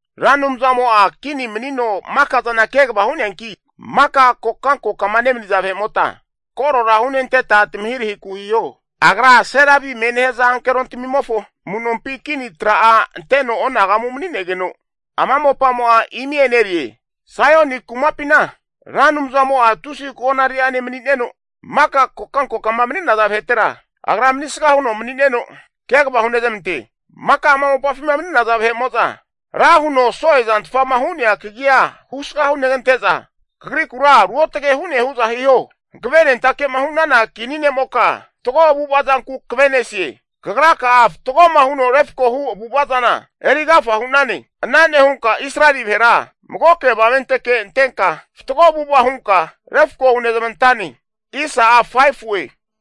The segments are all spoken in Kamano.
Ra Anumzamo'a kini manino maka zana kegava hu'neanki, maka kokanko'ma nemaniza vahe'mota korora hunenteta tamahirahiku hiho. Agra serabimie nehaza ankerontremofo amu'nompi kini tra'a anteno onagamu mani'negeno, ama mopamo'a imi enerie. Saioni kumapina Ra Anumzamo'a tusi konariri'ane mani'neno, maka kokankokama mani'naza vahetera Agra manisga huno mani'neno kegava hunezmante. Maka ama mopafima mani'naza, vahe'mo'za ra huno so'e zantfama hu'nea kagia husga hunegante'za, kagrikura ruotage hu'ne hu'za hiho. Hankavenentake'ma hu'nana kini ne'moka, fatgo avu'ava zanku kave'nesie. Kagraka'a fatgoma huno refko hu avu'ava zana eri agafa hu'nane. Ana nehunka Israeli vahera magoke avamente antenka fatgo avu'ava hunka refko hunezmantane.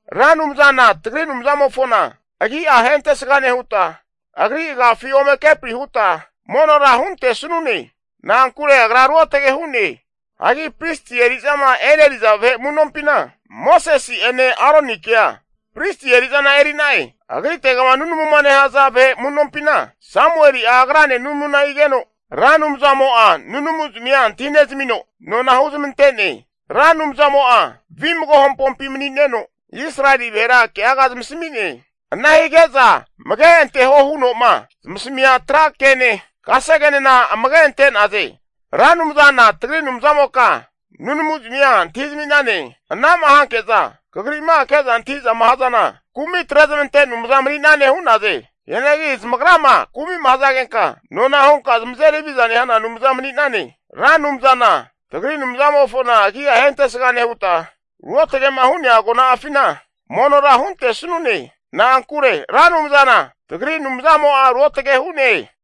Ra Anumzana tagri Anumzamofona agi'a ahentesga nehuta, agri agafi ome kepri huta monora huntesnune. Na'ankure agra ruotage hu'ne. Hagi pristi eri'zama eneriza vahe amu'nompina, Mosesi'ene Aronikea pristi eri'zana eri'na'e. Agritegama nunamuma nehaza vahe amu'nompina, Samueli'a agrane nunamuna higeno, Ra Anumzamo'a nunamuzamia antahi nezamino nona huzmante'ne. Ra Anumzamo'a vimago hampompi mani'neno, Israeli vahera keaga zamasami'ne. Ana hige'za amage anteho huno'ma zamasamia tra kene, kasegenena amage ante'naze. Ra Anumzana tagri Anumzamoka nunamu zamia antahi zami'nane. Ana'ma hanke'za kagri'ma ke'za antahi'zama hazana, kumi atre zamante Anumza mani'nane hu'naze. Hianagi zamagrama kumi'ma hazagenka nona hunka zamazeri haviza nehana Anumza mani'nane. Ra Anumzana tagri Anumzamofona agi'a ahentesga nehuta, ruotage'ma hu'nea agona'afina monora huntesnune. Na'ankure Ra Anumzana tagri Anumzamo'a ruotage hu'ne.